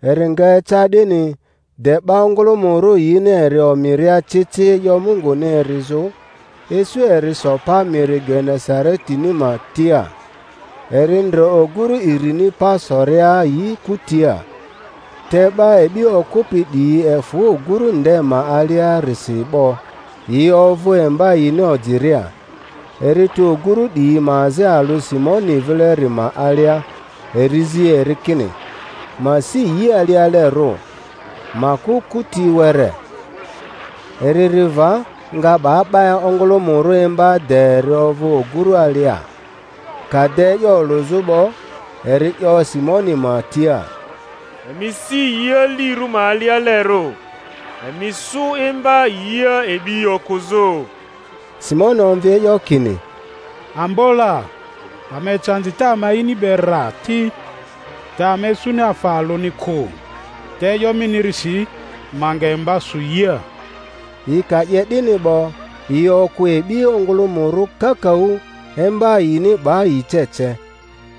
Eri nga eca 'dini, de 'ba ongᴜlᴜmᴜrᴜ yini eri omiria ci ci e'yo Munguni erizᴜ, isu eri so pa miri Genesaretini ma tia. Eri ndre oguru irini pa soria yi kutia; te 'ba e'bi okᴜpi 'diyi efᴜ oguru nde ma aliarisi 'bo, yi ovᴜ emba yini ojiria. Eri tu oguru 'diyi ma azi alᴜ Simoni vileri ma alia, eri zi eri kini ma si yi alialerᴜ, ma kᴜ kuti were. Eri ri va, nga 'ba 'ba ongᴜlᴜmᴜrᴜ imba de eri ovᴜ oguru alia. Ka de e'yo olᴜzᴜ 'bo, eri 'yo Simoni ma tia, Emi si yi alirᴜ ma alialerᴜ, emi sᴜ emba yia e'bi okᴜzᴜ. Simoni omvi e'yo kini, Ambo la, ama ecandi te ama ini be rra ti, te ama isuni afa alᴜni kᴜ! Te e'yo minirisi ma nga emba sᴜ yia. Yi ka 'ye 'dini 'bo, yi okᴜ e'bi ongᴜlᴜmᴜrᴜ kakaᴜ; emba yini 'ba yi ce ce;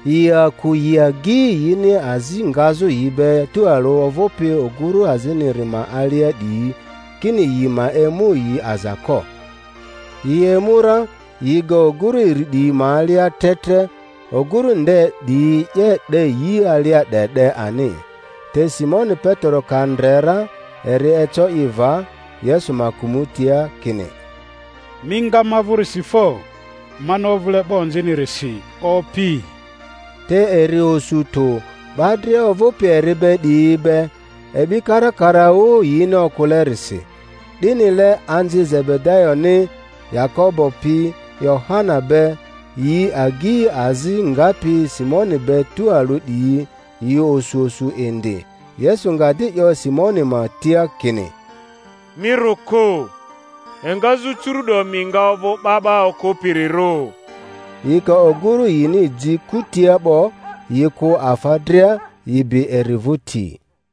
yi aku yi agyi yini azi ngazᴜ yi be tualᴜ ovᴜpi oguru aziniri ma alia 'diyi, kini yi ma emu yi aza ko. Yi emu ra, yi ga ogurᴜ iri 'diyi ma alia tre tre, oguru nde 'diyi 'ye 'de yi alia 'de 'de ani. Te Simoni Petero ka ndre ra, eri eco i va Yesu ma kᴜmᴜtia, kini, Mi nga ma vᴜrisi fo, mani ovᴜle 'ba onzinirisi, Opi! Te eri osu tᴜ, 'ba dria ovᴜpi eri be 'diyi be, e'bi karakaraᴜ yini okᴜlerisi; 'dinile anzi Zebedayoni, Yakobo pi Yohana be, yi agyi azi ngapi Simoni be tualᴜ 'diyi, yi osu osu indi. Yesu nga di 'yo Simoni ma tia kini, Mi rᴜ kᴜ; engazᴜ curu'do mi nga ovᴜ 'ba 'ba okᴜpirirᴜ. Yi ka oguru yini ji kutia 'bo, yi kᴜ afa dria, yi bi eri vᴜti.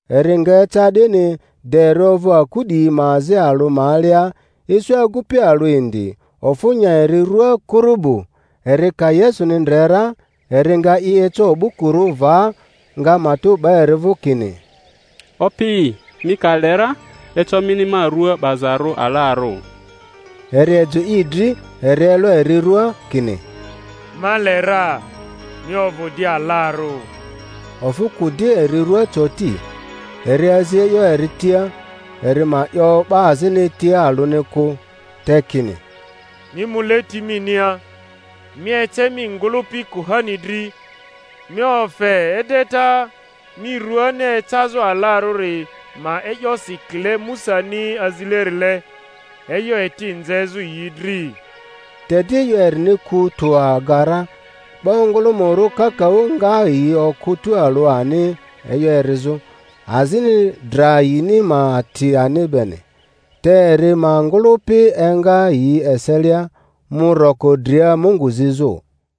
Eri nga eca 'dini, de eri ovᴜ aku 'diyi ma azi alᴜ ma alia, isu agupi alᴜ indi, ofᴜ nya eri rua kurubu; eri ka Yesuni ndre ra, eri nga i eco o'bukurᴜ va, nga matᴜ 'ba eri vᴜ kini, Opi, mi ka le ra, eco mini ma rᴜa 'bazarᴜ alarᴜ. Eri ejᴜ i dri, eri elo eri rua, kini, Ma le ra; mi ovᴜ di alarᴜ. Ofᴜ kᴜ di eri rua coti. Eri azi e'yo eri tia, eri ma 'yo 'ba azini tia alᴜni kᴜ; te kini, Mi mu leti minia, mi ece mi ngᴜlᴜpi kuhani dri, mi ofe edeta mi ruani ecazᴜ 'alarᴜri ma e'yosi kile Musani azilerile, e'yo eti nzezᴜ yi dri. Te di e'yo erini ku tᴜ aga ra; 'ba ongᴜlᴜmᴜrᴜ kakaᴜ nga yi okᴜ tᴜalᴜ ani e'yo erizᴜ, azini dra yini ma ati ani beni. Te eri ma ngᴜlᴜpi enga yi eselia, mu roko dria Mungu zizᴜ.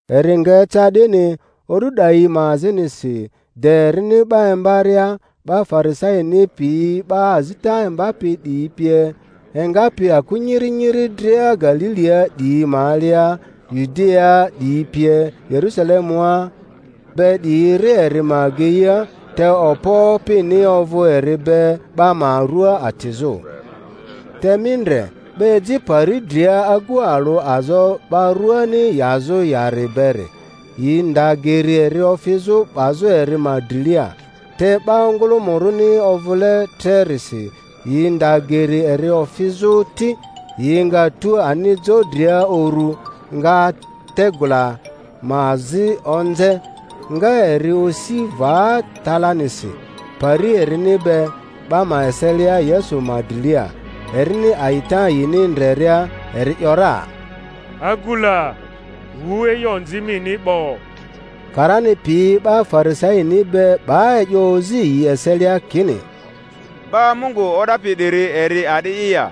Eri nga eca 'dini, o'du 'dayi ma azinisi, de erini 'ba imbaria, 'ba Farisaini piyi 'ba azita imbapi 'diyi pie, engapi aku nyiri nyiri dria Galilia 'diyi ma alia, Yudiaa 'diyi pie, Yerusalemua be 'diyi ri eri ma ageia; te okpo Opini ovᴜ eri be 'ba ma rᴜa atizᴜ. Te mi ndre, 'ba eji pari dria agu alᴜ azo 'ba rᴜani yazᴜ yari beri, yi nda geri eri ofizᴜ 'bazᴜ eri ma drilia; te 'ba ongᴜlᴜmᴜrᴜni ovᴜle trerisi, yi nda geri eri ofizᴜ ti, yi nga tu ani jo dria uru, nga tegula ma azi onze, nga eri osi va talanisi pari erini be 'ba ma eselia Yesu ma drilia. Erini a'ita yini ndreria, eri ‘yora, Agu la, wu e'yo onzi mini 'bo. Karani piyi 'ba Farisaini be 'ba e'yo ozi yi eselia kini, 'Ba Mungu o'dapi 'diri eri a'di'i ya?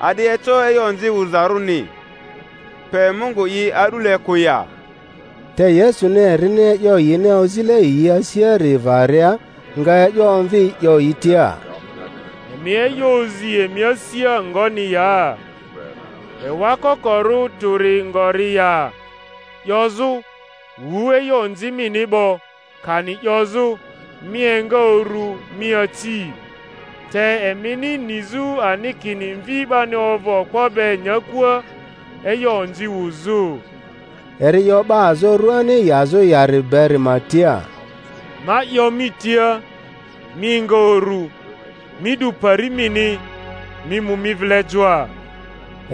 A'di eco e'yo onzi wuzarᴜni, pe Mungu'i a'dule kᴜ ya? Te Yesuni erini e'yo yini ozile yi asiari varia, nga e'yo omvi 'yo yi tia, Emi e'yo ozi emi asia ngoni ya? Ewa kokorᴜ tᴜri ngori ya, 'yozᴜ, Wu e'yo onzi mini 'bo; kani 'yozᴜ, Mi enga uru, mi aci? Te emini nizᴜ ani kini Mvi 'bani ovᴜ okpo be nyakua e'yo onzi wuzᴜ, (eri 'yo 'ba azo ruani yazᴜ yari beri ma tia) Ma 'yo mi tia, mi enga uru, mi 'du pari mini, mi mu mi vile joa.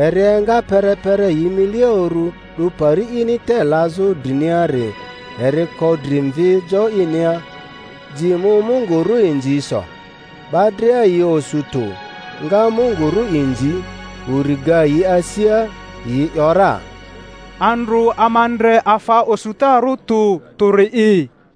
Eri enga perepere yi milia uru, 'du pari ini te lazᴜ driniari, eri ko dri mvi jo inia, ji mu Mungu ru inzi so. 'Ba dria yi osu tᴜ, nga Mungu ru inzi; uri ga yi asia, yi ‘yora, Andrᴜ ama ndre afa osutarᴜ tᴜ tᴜri'i.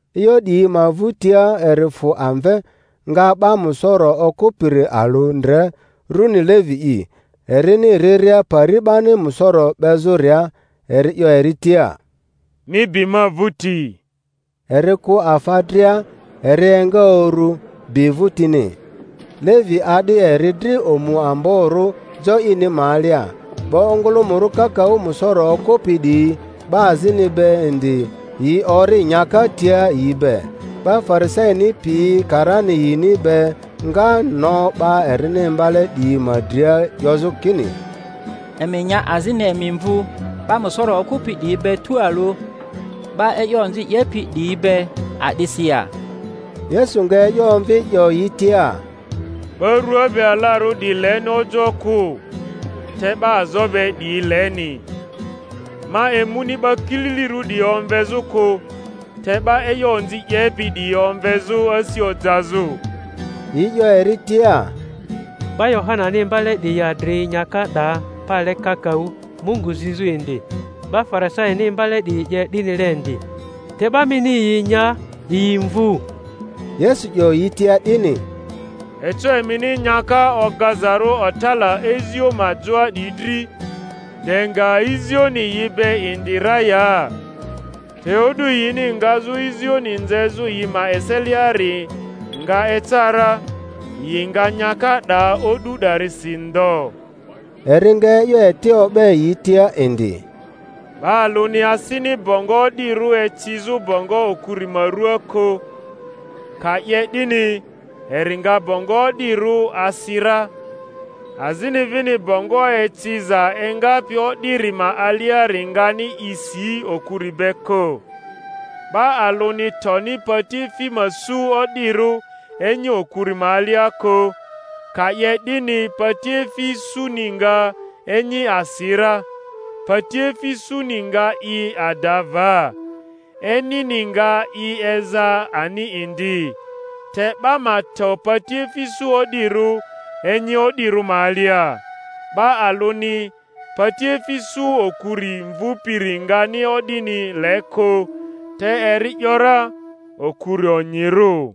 E'yo 'diyi ma vᴜtia eri fᴜ amve, nga 'ba musoro okᴜpiri alᴜ ndre, runi Levi'i, erini riria pari 'bani musoro 'bezᴜria; eri 'yo eri tia, Mi bi ma vᴜti. Eri kᴜ afa dria, eri enga uru, bi vᴜtini. Levi a'di eri dri omu amborᴜ jo ini ma alia; 'ba ongᴜlᴜmᴜrᴜ kakaᴜ musoro okᴜpi 'diyi 'ba azini be indi, yi ori nyaka tia yi be. 'Ba Farisaini piyi karani yini be nga no 'ba erini imbale 'diyi ma dria, 'yozᴜ kini, Emi nya azini emi mvu 'ba musoro okᴜpi 'diyi be tualᴜ, 'ba e'yo onzi 'yepi 'diyi be, a'disi ya? Yesu nga e'yo omvi, 'yo yi tia, Ba rua be alarᴜ 'diyi leni ojoᴜ kᴜ, te 'ba azo be 'diyi leni; ma emuni 'ba kililirᴜ 'diyi omvezᴜ kᴜ, te 'ba e'yo onzi 'yepi 'diyi omvezᴜ asi ojazᴜ. Yi 'yo eri tia, 'Ba Yohanani imbale 'diyi adri nyaka 'da pale kakaᴜ, Mungu zizᴜ indi, 'ba Farisaini imbale 'diyi 'ye 'dinile indi; te 'ba mini yi nya, yi mvᴜ. Yesu 'yo yi tia 'dini, Eco emini nyaka ogazarᴜ otala izio ma joa 'diyi dri, de nga izioni yi be indi ra ya? Te o'du yini ngazᴜ izioni nzezᴜ yi ma eseliari nga eca ra, yi nga nyaka 'da o'du 'darisi ndo. Eri nga e'yo eti o'be yi tia indi: Ba alᴜni asini bongo o'dirᴜ ecizᴜ bongo okuri ma ruaa kᴜ; ka 'ye 'dini, eri nga bongo o'dirᴜ asi ra, azini vini bongo eciza engapi o'diri ma aliari ngani i si okuri be kᴜ. 'Ba alᴜni toni patiefi ma su o'dirᴜ enyi okuri ma alia kᴜ; ka 'ye 'dini, patiefi suni nga enyi asi ra, patiefi suni nga i ada va, enyini nga i eza ani indi. Te 'ba ma to patiefi su o'dirᴜ enyi o'dirᴜ ma alia. 'Ba alᴜni patiefi su okuri mvupiri ngani o'dini le kᴜ; te eri ‘yora, Okuri onyirᴜ.